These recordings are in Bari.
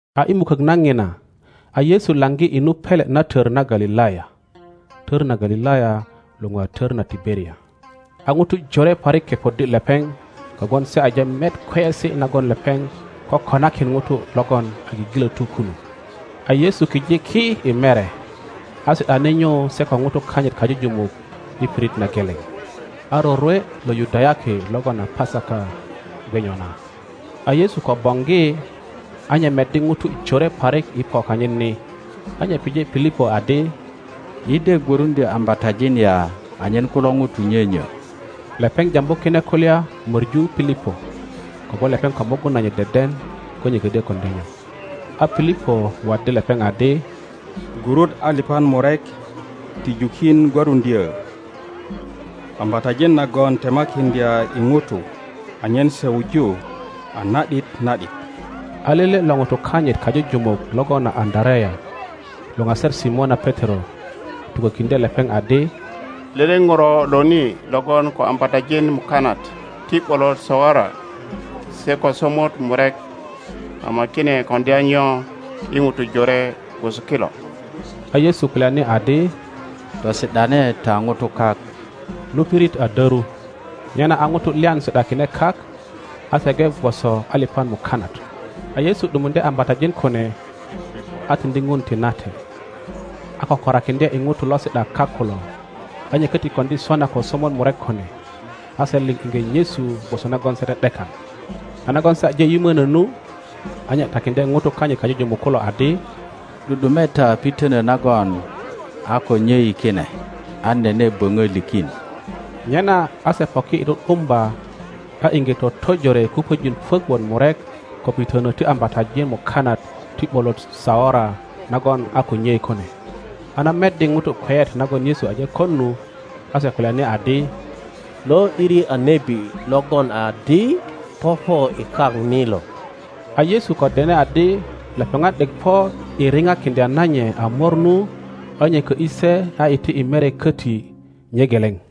A i mukok na ŋina, a Yesu laŋgi i nu pele na tor na Galilaya. (Tor na Galilaya luŋu a Tor na Tiberia.) A ŋutu Jore parik kepoddi lepeŋ kogwon se aje met kweyesi nagon lepeŋ kokonakin ŋutu logon a gigilotu kunu. A Yesu kijiki i mere, a si ’dani nyu se ko ŋutu kanyit kajujumuk i pirit na geleŋ. A rorwe lo Yudayaki logon a Pasaka gwe nyona. A Yesu ko boŋgi, a nye meddi ŋutu jore parik i po kanyit ni, a nye pije Pilipo adi, Yi de gworundyo ambatajin ya anyen kulo ŋutu nyonyo? Lepeŋ jambu kine kulya moru Pilipo; kogwon lepeŋ ko mugun nanyit deden ko nye kodyo koŋdya nyo. A Pilipo waddi lepeŋ adi, Gurut alipan murek ti jukin gwöruŋdyö ambatajin nagon temakiŋdya i ŋutu anyen se wuju a na ’dit na ’dit. A lele lo ŋutu kanyit kajujumuk logon a Andarea luŋaser Simona Petero, tukokiŋdye lepeŋ adi, Lele ŋuro lo ni logon ko ambatajin mukanat ti ’bolot saora se ko somot murek; ama kine koŋdya nyo i ŋutu jore gwoso kilo? A Yesu kulyani adi, Tosi ’dane ta ŋutu kak. Nu pirit a doru, nyena a ŋutu lyan si ’dakine kak; a se gwe gwoso alipan mukanat. A Yesu ’dumuŋdye ambatajin kune, a tiŋdi Ŋun tinate, a kökorakiŋdye i ŋutu lo si ’da kak kulo, a nye koti koŋdi sona ko somot murek kune. A se liŋ iŋge nyesu gwoso nagon se ’de ’dekan. A nagon se aje yimönö nu, a nye takiŋdye ŋutu kanyit kajujumuk kulo adi, ’Du ’dume ta pitönö nagon a ko nyei kine, an nene böŋö likin. Nyena a se poki i ’du’dumba, a iŋge totojore kupöjin puök wot murek ko pitönö ti ambatajin mukanat ti ’bolot saora nagon a ko nyei kune. A na meddi ŋutu kweyet nagon Yesu aje kon nu, a se kulyani adi, Lo ’diri a nebi logon adi popo i kak ni lo.Kiko lo gwon Yerusalema lukata A Yesu ko dene adi lepeŋat ’dek po i ripakiŋdya na nye a mor nu, a nye kö ’yi se a iti i mere koti nye geleŋ.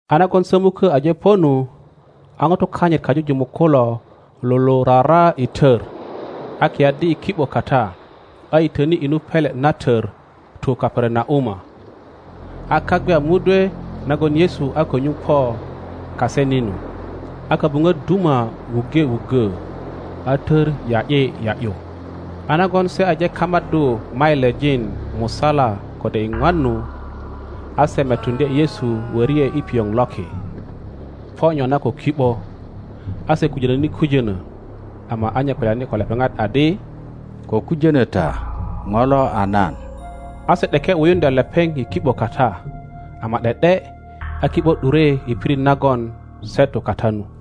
A nagon sömukö aje po nu, a ŋutu kanyit kajujumuk kulo lulurara i tor, a kiyaddi i ki ’bo kata, a yitöni i nu pele na tor tu Kaperanauma. A kak gwe a mudwe nagon Yesu a ko nyuŋ po kase ni nu; a kobuŋöt duma wuŋge wuggö a tor ya ’yi ya ’yu. A nagon se aje kamaddu mailijin musala kode iŋwan nu, a se metuŋdye Yesu wori ’e i pioŋ loki, po nyona ko ki ’bo; a se kujönoni kujönö. Ama a nye kulyani ko lepeŋat adi, Ko kujönö ta, ŋo lo a nan. A se ’deke wuyuŋdya lepeŋ i ki ’bo kata, ama ’de ’de a ki ’bo ’dure i pirit nagon se tu kata nu.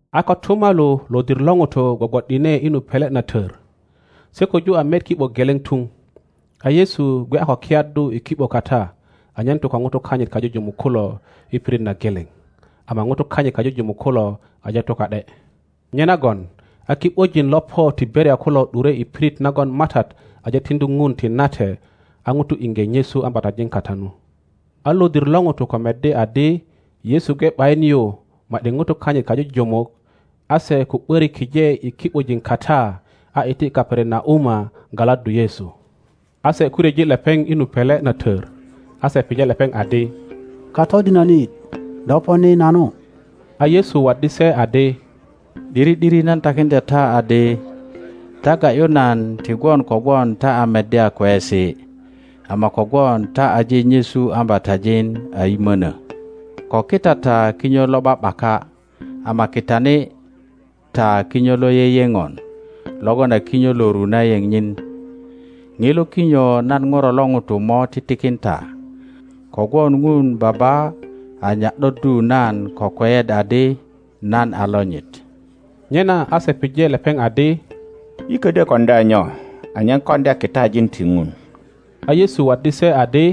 A kotumalu lodir lo ŋutu gwogwo’dine i nu pele na tör. Se koju a met ki ’bo geleŋ tuŋ, a Yesu gwe a ko kiyaddu i ki ’bo kata anyen tu ko ŋutu kanyit kajujumuk kulo i pirit na geleŋ, ama ŋutu kanyit kajujumuk kulo aje tu ka ’de. Nyenagon a ki ’bojin lo po Tiberia kulo ’dure i pirit nagon MATAT aje tiŋdu Ŋun tinate a ŋutu iŋge nyesu ambatajin kata nu. A lodir lo ŋutu ko meddi adi Yesu gwe ’bayin yu ma ’di ŋutu kanyit kajujumuk, a se ko ’börik kije i ki ’bojin kata a iti Kaperanauma galaddu Yesu. A se ko ryeji lepeŋ i nu pele na tör, a se pije lepeŋ adi, Katodinönit, do po ni nanu? A Yesu waddi se adi, ’Diri ’diri nan takiŋdya ta adi, ta ga ’yu nan ti gwon kogwon ta a meddya kweyesi, ama kogwon ta aje nyesu ambatajin a yimönö. Ko kita ta kinyo lo ’ba ’baka, ama kitani ta kinyo lo yeyeŋon logon a kinyo lo ru na yeŋ nyin. Ŋilo kinyo nan Ŋuro lo ŋuto mo titikin ta; kogwon Ŋun Baba a nya ’doddu nan ko kweyet adi nan a lonyit. Nyena a se pije lepeŋ adi, Yi ködyö koŋdya nyo anyen koŋdya kitajin ti Ŋun? A Yesu waddi se adi,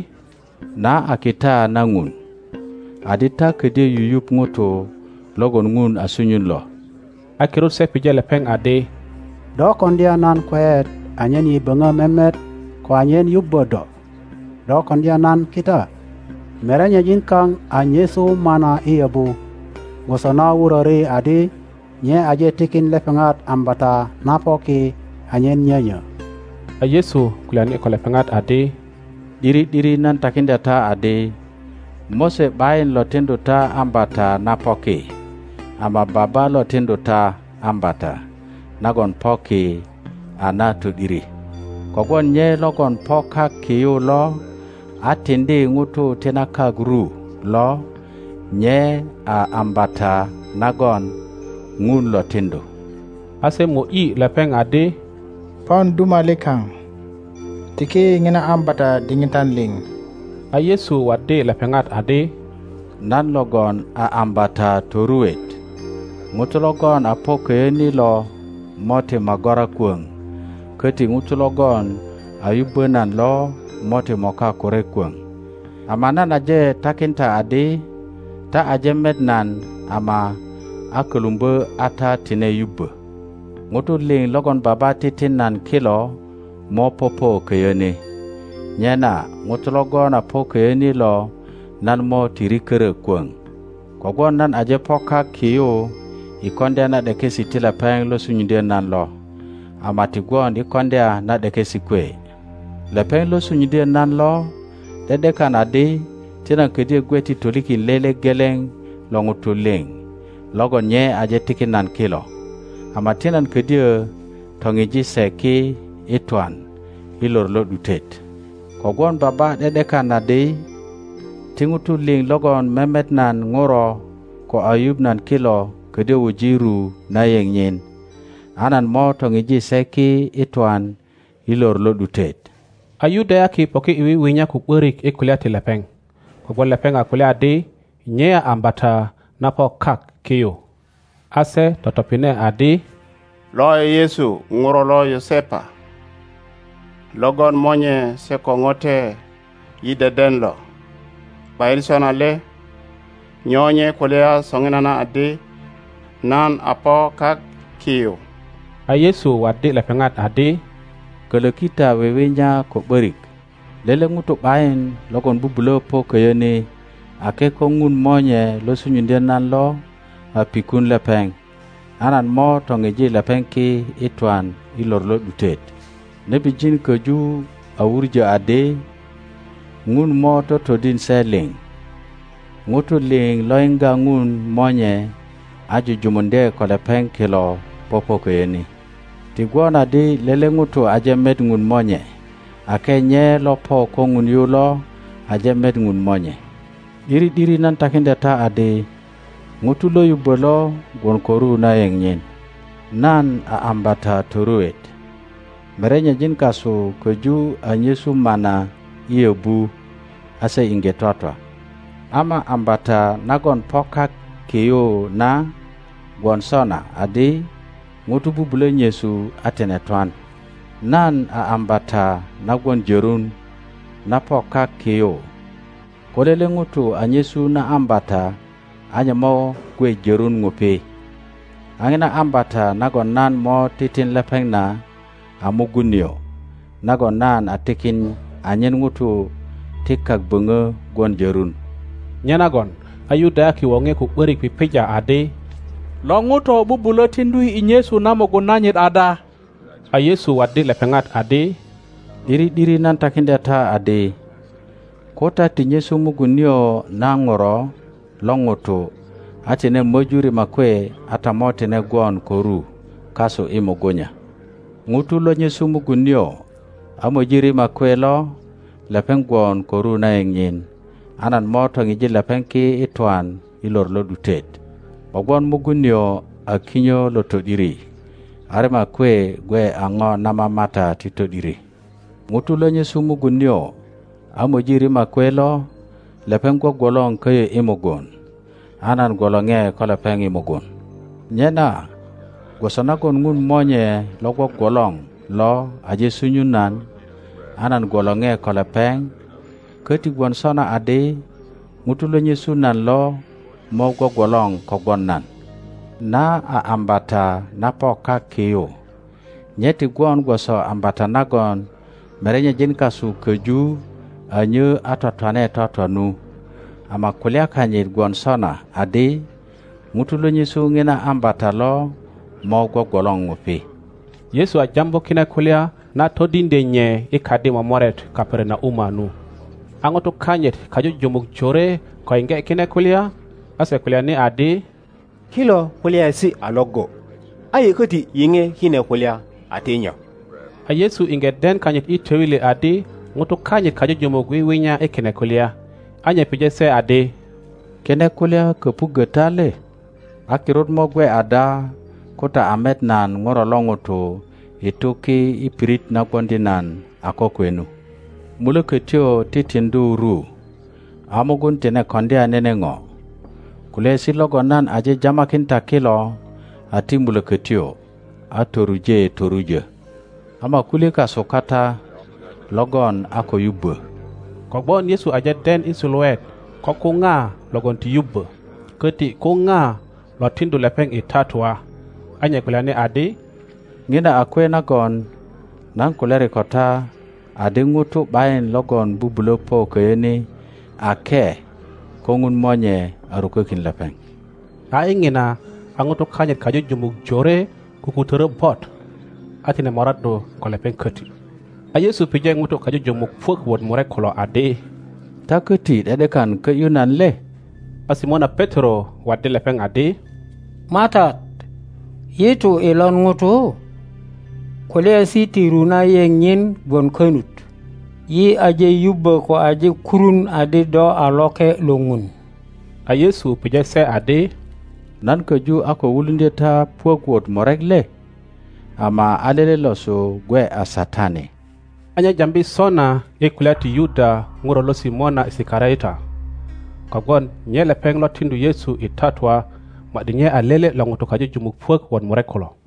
Na a kita na Ŋun, adi ta kodyö yuyuŋ ŋuto logon Ŋun a sunyun lo. A kirut se pije lepeŋ adi, Do koŋdya nan kweyet anyen yi böŋö memet ko anyen yubbö do? Do koŋdya nan kita? Merenyejin kaŋ a nyesu mana i yöbu, gwoso na wuröri adi, Nye aje tikin lepeŋat ambata na po ki anyen nyönyö. A Yesu kulyani ko lepeŋat adi, ’Diri ’diri nan takiŋdya ta adi, Mose ’bayin lo tiŋdu ta ambata na po ki, ama Baba lo tiŋdu ta ambata nagon po ki a na to ’diri. Kogwon nye logon po kak ki yu lo a tiŋdi ŋutu ti na kak ru lo, nye a ambata nagon Ŋun lo tiŋdu. A se mo ’yi lepeŋ adi, Pon duma likaŋ, tiki yi ŋina ambata diŋitan liŋ. A Yesu waddi lepeŋat adi, Nan logon a ambata toruet; ŋuto logon a po köyö ni lo mo ti magora kwöŋ, köti ŋuto logon a yubbö nan lo mo ti moka kure kwöŋ. Ama nan aje takin ta adi ta aje met nan ama a kölumbö a ta tine yubbö. Ŋutu liŋ logon Baba titin nan kilo mo popo köyö ni, nyena ŋuto logon a po köyö ni lo nan mo ti rikörö kwöŋ, kogwon nan aje po kak ki yu i koŋdya na ’dekesi ti lepeŋ lo sunyuŋdyö nan lo, ama ti gwon i koŋdya na ’dekesi kwe. Lepeŋ lo sunyuŋdyö nan lo ’de ’dekan adi, ti nan ködyö gwe ti tolikin lele geleŋ lo ŋutu liŋ logon nye aje tikin nan kilo, ama ti nan ködyö toŋiji se ki i twan i lor lo ’dutet. Kogwon Baba ’de ’dekan adi, ti ŋutu liŋ logon memet nan Ŋuro ko a yuŋ nan kilo ködyö wuji ru na yeŋ nyin; a nan mo toŋiji se ki i twan i lor lo ’dutet. A Yudayaki poki i wiwinya ko ’börik i kulya ti lepeŋ, kogwon lepeŋ a kulya adi nye a ambata na po kak ki yu. A se totopine adi, Lo a Yesu ŋuro lo Yosepa, logon monye se ko ŋote yi deden lo, ’bayin sona le? Nyo nye kulya soŋinana adi, Nan a po kak ki yu. A Yesu waddi lepeŋat adi, Kölöki ta wiwinya ko ’börik. Lele ŋuto ’bayin logon bubulö po köyö ni, ake ko Ŋun Monye lo sunyuŋdyö nan lo a pikun lepeŋ; a nan mo toŋiji lepeŋ ki i twan i lor lo ’dutet. Nebijin köju a wuŋö adi, Ŋun mo totodin se liŋ. ŋutu liŋ lo yiŋga Ŋun Monye a jujumuŋdye ko lepeŋ kilo popo köyö ni. Ti gwon adi lele ŋuto aje met Ŋun Monye ake nye lo po ko Ŋun yu lo aje met Ŋun Monye. ’Diri ’diri nan takiŋdya ta adi, ŋuto lo yubbo lo gwon ko ru na yeŋ nyin. Nan a ambata toruet. Merenyejin kasu köju a nyesu mana i yöbu, a se iŋge twatwa. Ama ambata nagon po kak ki yu na gwon sona adi, ŋuto bubulö nyesu a tine twan. Nan a ambata na gwon jörun na po kak ki yu. Ko lele ŋuto a nyesu na ambata a nye mo gwe jörun ŋupi; a ŋina ambata nagon nan mo titin lepeŋ na a mugun nio, nagon nan a tikin anyen ŋutu ti kak böŋö gwon jörun. Nyenagon a Yudayaki woŋe ko ’börik pipija adi, Lo ŋuto bubulö tiŋdu yi i nyesu na mugun nanyit ada? a Yesu waddi lepeŋat adi, ’Diri ’diri nan takiŋdya ta adi, ko ta ti nyesu mugun nio na Ŋuro lo ŋuto a tine möju rima kwe, a ta mo tine gwon ko ru kasu i mugunya. Ŋuto lo nyesu mugun nio a möji rima kwe lo, lepeŋ gwon ko ru na yeŋ nyin, a nan mo toŋi lepeŋ ki i twan i lor lo ’dutet. Kogwon mugun nio a kinyo lo to ’diri, a rima kwe gwe a ŋo na mamata ti to ’diri. Ŋuto lo nyesu mugun nio a moji rima kwe lo, lepeŋ gwogwolor koyo i mugun, a nan gwolore ko lepeŋ mugun. Nyena gwoso nagon Ŋun Monye lo gwogwolor lo aje sunyun nan, a nan gwolore kogwon lepeŋ, köti gwon sona adi ŋuto lo nyesu nan lo mo gwogwolor kogwon nan. Na a ambata na po kak ki yu; nye ti gwon gwoso ambata nagon merenyejin kasu köju a nyö a twatwane twatwa nu, ama kulya kanyit gwon sona adi, ŋuto lo nyesu ŋina ambata lo mo gwogwolor ŋupi. Yesu a jambu kine kulya na todiŋdye nye i kadi momoret Kaperanauma nu. A ŋutu kanyit kajujumuk jore ko yiŋge kine kulya, a se kulyani adi, Kilo kulyaesi a iŋgo, a yi koti yiŋe kine kulya a ti nyo? A Yesu iŋge den kanyit i töili adi ŋutu kanyit kajujumuk wiwinya i kine kulya, a nye pije se adi, Kine kulya köpuggö ta le? a kirut mo gwe ada ko ta a met nan Ŋuro lo ŋuto i tu ki i pirit na gwoŋdi nan a kokwe nu? Mulökötyo titiŋdu ru, a mugun tine koŋdya nene ŋo. Kulyaesi logon nan aje jamakin ta kilo a ti mulokotyo a toruje torujo. Ama kulye kasu kata logon a ko yubbo. Kogwon Yesu aje den i suluet ko ko ŋa logon ti yubbö, koti ko ŋa lo tiŋdu lepeŋ i tatua. A nye kulyani adi, Ŋina a kwe nagon nan kulyari ko ta adi ŋuto ’bayin logon bubulö po köyö ni ake ko Ŋun Monye a rukokin lepeŋ. A i ŋina a ŋutu kanyit kajujumuk jore kukutöro bot, a tine moraddu ko lepeŋ koti. a Yesu pije ŋutu kajujumuk puök wot murek kulo adi, Ta köti ’de ’dekan kö ’yu nan le? a Simona Petero waddi lepeŋ adi, MATAT, yi tu i lon ŋuto? Kulyaesi ti ru na yeŋ nyin gwon konut. Yi aje yubbö ko aje kurun adi do a Loke lo Ŋun. a Yesu pije se adi, Nan köju a ko wuluŋdyö ta puök wot murek le? Ama a lele losu gwe a satani. A nye jambi sona i kulya ti Yuda ŋuro lo Simona Isikariota, kogwon nye lepeŋ lo tiŋdu Yesu i tatua ma ’di nye a lele lo ŋutu kajujumuk puök wot murek kulo.